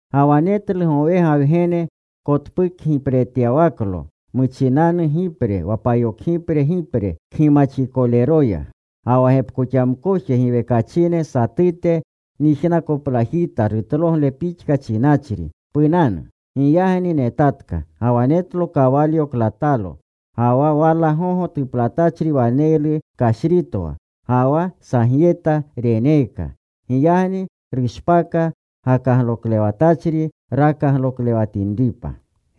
Ga wa netlu gowega Wgene kotpukgipretyawaklo muchinanu gipre wa payokgipre gipre kgimaxikoleroya. Ga wa gepkoxamkoje giwekachine satute nyijnakoplajita rutlogle pixka chinachri, “Punanu.” Giyagni netatka. Ga wa netlo kawalyo klatalo. Ga wa wala gogo tuplatachri waneylu kashritwa. Ga wa sagyeta reneeka. Giyagni rushpaka gakagloklewatachri rakagloklewatinripa.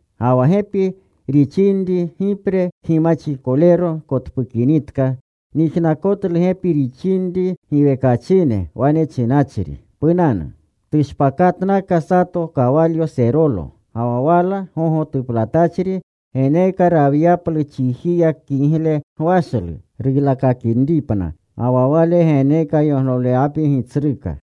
Ga wa gepi rixinri gipre kgimaxikolero kotpukinitka, nyijnakotlu gepi rixinri giwekachine wane chinachri, “Punanu.” Tushpakatnaka sato kawalyo serolo. Ga wa wala gogo tuplatachri geneeka rawyaplu chijiya kigle gwashlu, ruylakakinripna. Ga wa wale geneeka yoglolewapi gitsruka.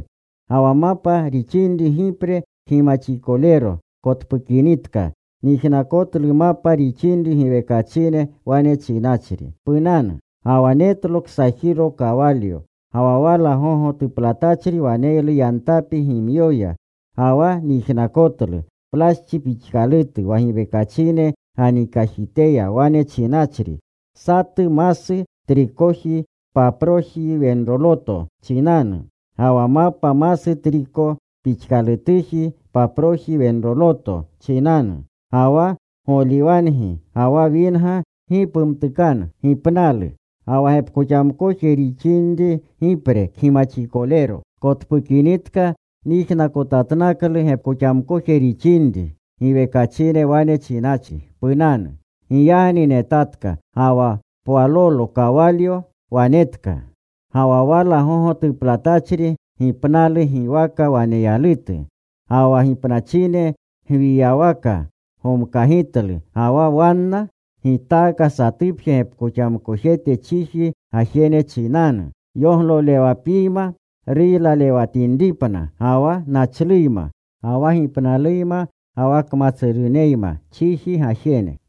Ga wa mapa rixinri gipre kgimaxikolero kotpukinitka, nyijnakotlu mapa rixinri giwekachine wane chinachri, “Punanu.” Ga wa netlo ksajiro kawalyo. Ga wa wala gogo tuplatachri waneylu yantapi gimyoya. Ga wa nyijnakotlu plaschi pixkalutu wa giwekachine ganikajiteya wane chinachri, “Satu masu trikoji paproji wenroloto chinanu, ga wa mapa masu triko pixkalutuji paproji wenroloto chinanu. Ga wa goliwangi ga wa winga gi pumtukanu.” Ga wa gepkoxamkoje rixinri gipre kgimaxikolero kotpukinitka, nyijnaktokanutlu gepkoxamkoje rixinri giwekachine wane chinachri, “Punanu.” Giyagni netatka. Ga wa pwalolo kawalyo wanetka. Ga wa wala gogo tuplatachri Gipnalu giwaka waneyalutu. Ga wa gipnachine gwiyawaka gomkagitlu. Ga wa wanna gitaaka satupje gepkoxamkojete chiji gajene chinanu, yoglolewapiyma ruylalewatinripna, ga wa nachluyma, ga wa gipnaluyma, ga wa kmatsuruneyma, chiji gajene.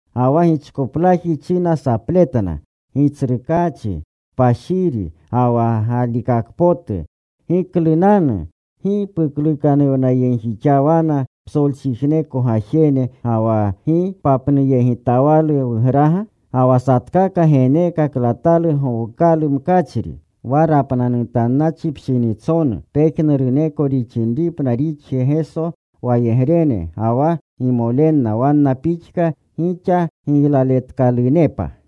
Ga wa gichkoplaji china sapletna, “Gitsrukaachi kpashiri ga wa galikakpotu, ¿giklunanu gi puklukanuwnayegjixawana psolchijneko gajene, ga wa gi papnuyegitawalu wugraga?” Ga wa satkaka geneeka klatalu gowukalu mkachri. Wane chinkana wa rapnanutanunnachi pshinitsonu pejnuruneko rixinripna rixje Geso wayegrene ga wa gimolenna wanna pixka gixa giylaletkalunepa.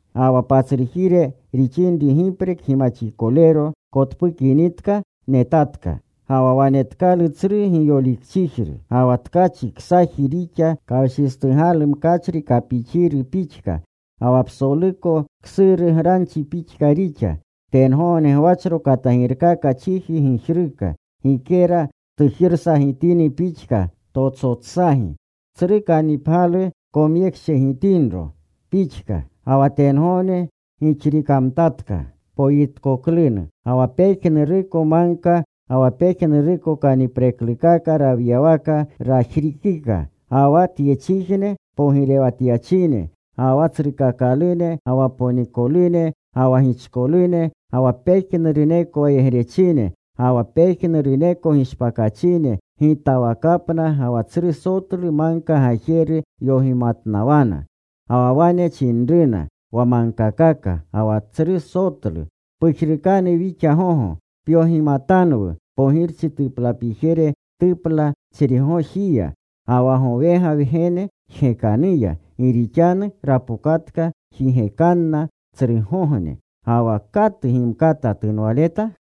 Ga wa patsrujire rixinri gipre kgimaxikolero kotpukinitka, netatka. Ga wa wanetkalu tsru giyolikchijru. Ga wa tkachi ksaji rixa kawshistugalu mkachri kapixiru pixka. Ga wa psoluko ksuru granchi pixka rixa. Tengogne gwachro katagirkaka chiji gijruka, gikera tujirsagitini pixka totsotsagi, tsru kannipgyalu komyekshegitinro pixka. Ga wa tengogne gixrikamtatka kirukpoyi pixka poyitkoklunu. Ga wa pejnuruko magka ga wa pejnuruko kanipreklukaka rawyawaka rajrikika. Ga wa tyechijne pogirewatyachine, ga wa tsrukakalune, ga wa ksolaloterune, ga wa ponikolune, ga wa gichkolune, ga wa pejnuruneko wayegrechine, ga wa pejnuruneko gishpakachine, gitawakapna ga wa tsru sotlu magka gajeru yogimatnawana. Ga wa wane chinruna wa magkakaka ga wa tsru sotlu, “Pujrukanu wixa gogo. Pyogimatanwu pogirchi tuplapijere tuplatachrigojiya, ga wa gowega Wgene jgekanuya. Gi rixanu rapokatka jigekanna tsrugogne. Ga wa ¿katu gimkata tunwaleta?”